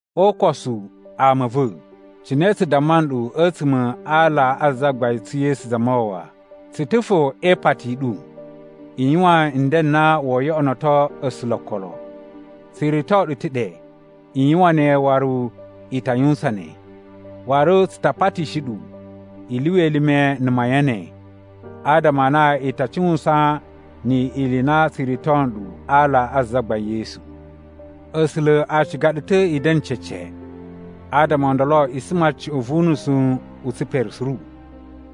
O ukosu, ama a̱ va̱, cine tsu damma nɗu a̱tsuma̱ a ala a Zagbain tsu Yesu Zamawawa, tsu ta̱ fo e ipati i ɗu i yuwan nden n na woo yoꞌonoto A̱sula̱ o okolo. Tsu rito ɗu ta̱ ɗe i yuwan ne waru i ta yuwusan ne. Waru tsu ta patishi ɗu i lyuwa elime na̱ mayan ne, adama a na i ta cuwusan ni ili i na tsu rito nɗu a ala a Zagbain Yesu. A̱sula̱ a ciga ɗu ta̱ i da̱na̱ cece, adama o ndolo i suma cuꞌun vu unusu u tsipere suru.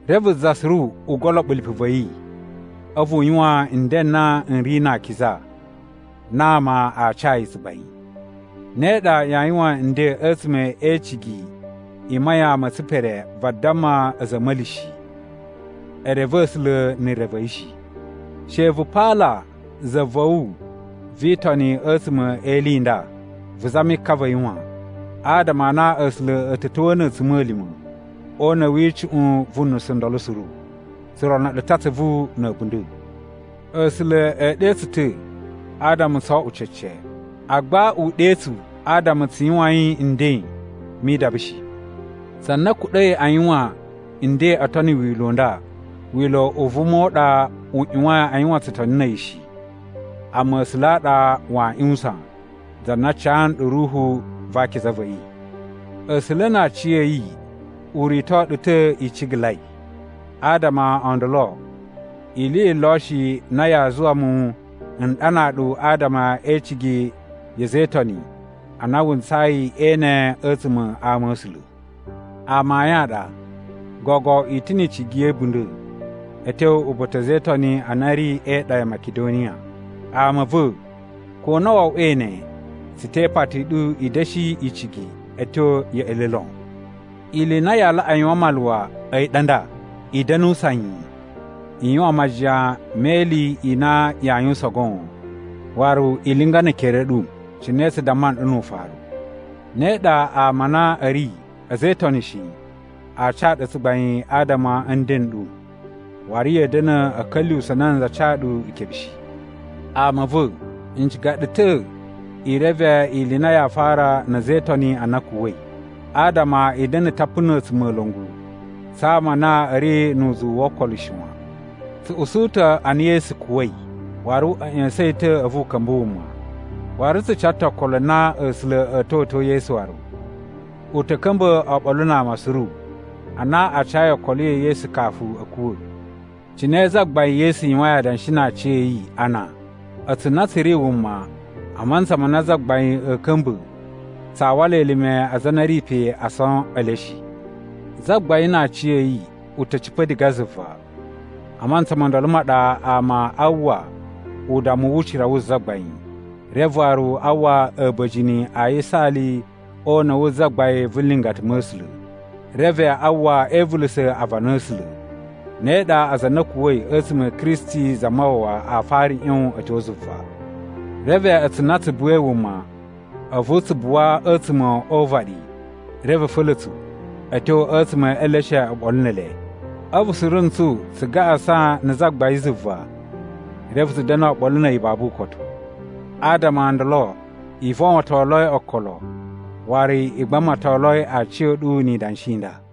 Reve za suru u goloɓo lipu va̱ yi, a̱vu u yuwan nden n na n ri na akiza na ama a ca yi tsugbain. Ne ɗa yaa yuwan nden a̱tsuma̱ e icigi i mayan ma̱ tsipere vadamma a̱za̱ a̱ a̱ma̱li shi. E reve A̱sula̱ na̱ re va̱ yi shi. She vu paala za va̱ wu vi Itoni a̱tsuma̱ e ili i nda, vu zami ka va̱ yi wan, adama a na A̱sula̱ a̱ ta̱ ta̱wa̱a̱ na̱ a̱tsuma̱lima̱ o una̱ wi icuꞌun vu nusu ndolo suru. Tsu rono ɗu ta̱ atsuvu na̱ a̱bunda̱. A̱sula̱ a̱ ɗe tsu ta̱ adama tso oꞌwo cece, agba u ɗe tsu adama tsu yuwain nden mi idaba shi. Za na kuɗa̱i a yuwan nden oo tono wila̱ u nda, wila̱ u vuma u ɗa u ꞌyuwain a yuwan tsutoni na̱ a̱yi shi, amma A̱sula̱ a ɗa waa ꞌyuwusan, za na ca nɗu Ruhu va Akiza va̱ yi. A̱sula̱ na aciya̱yi u rito ɗu ta̱ i cigalai, adama o ndolo ili yi lo shi na yaa zuwa mu n ɗanaa ɗu adama e icigi ya̱ a̱za̱ e Itoni a na wu ntsayi e ene a̱tsuma̱ a ama a̱ A̱sula̱. Amayun a ɗa, gogo i ta̱ ni icigi ya̱ a̱bunda̱ a̱ tyo uba̱ta̱ a̱za̱ e Itoni a na a̱ ri e iɗa ya Makidoniya. Ama a̱ va̱, ko na wo oꞌwoi ne, tsu te ipati i ɗu i da̱shi icigi a̱ tyo ya̱ꞌa̱ le lon. Ili i na yaa laꞌa yuwan maluwa a̱yi ɗa nda: I da̱nu sanyi, i yuwan majiyan me ili i na yaa yuwusan goon, waru i linga ne ekere a̱ ɗu, cine tsu damma nɗu nu ufaru. Ne ɗa ama a na a̱ ri a̱za̱ e Itoni shi a ca ɗu tsugbain adama a̱ nden n ɗu, waru ya̱a̱ da̱na̱ a̱ ka̱lyuwusa̱ nanza ca ɗu ikebe shi. Ama a̱ va̱, n ciga ɗu ta̱ i reve ili i na yaa fara na̱ a̱za̱ e Itoni a na a̱ kuwa̱i, adama i da̱na̱ tapu na̱ a̱tsumola̱ngu tsa ama a na a̱ ri nu uzuwu wo okolo shi wan. Tsu usu ta̱ a na Yesu kuwa̱i, waru a̱ ꞌya̱sa̱n yi ta̱ a̱vu u ka̱mba̱ wuma. Waru tsu ca ta̱ okolo na A̱sula̱ a̱a̱ ta̱wa̱to Yesu waru, u ta̱ ka̱mba̱ oɓolo na ama suru a na a cayi okolo ya̱ Yesu kafu a̱ kuwa̱. Cine Zagbain Yesu yuwain adanshi na aciya̱yi a na, a̱tsu na tsu ri wuma a mantsa ma na Zagbain a̱a̱ ka̱mba̱ tsaa wala elime a aza a na a̱ ri pe ason e le shi. Zagbain na aciya̱yi u ta̱ cipa̱ diga zuva. A mantsa ma ndolo ma ɗa ama a uwwa udammu wu ucira wu Zagbain, reve waru a uwwa a̱ba̱jini a yisaali o una̱ wu zagbain vu nlingata ma̱ A̱sula̱, reve a uwwa e ivulusa̱ aavana a̱ A̱sula̱. Ne ɗa, aza a na a̱ kuwa̱i a̱tsuma̱ a̱ Kristi Zamawawa a fara ꞌyon a̱ tyo zuva. Reve a̱tsu na tsu buwai wuma a̱vu tsu buwa a̱tsuma̱ o uvaɗi reve a̱ fa̱la̱ tsu a̱ tyo a̱tsuma̱ e eleshe oɓolo ne ele, a̱vu suru ntsu tsu gaꞌasan na̱ Zagbain zuva reve tsu da̱na̱ oɓolo na̱ a̱yi babu ukotu. Adama o ndolo i vowontoloi okolo waru i gbamatoloi aciya̱ɗu ni idanshi i nda.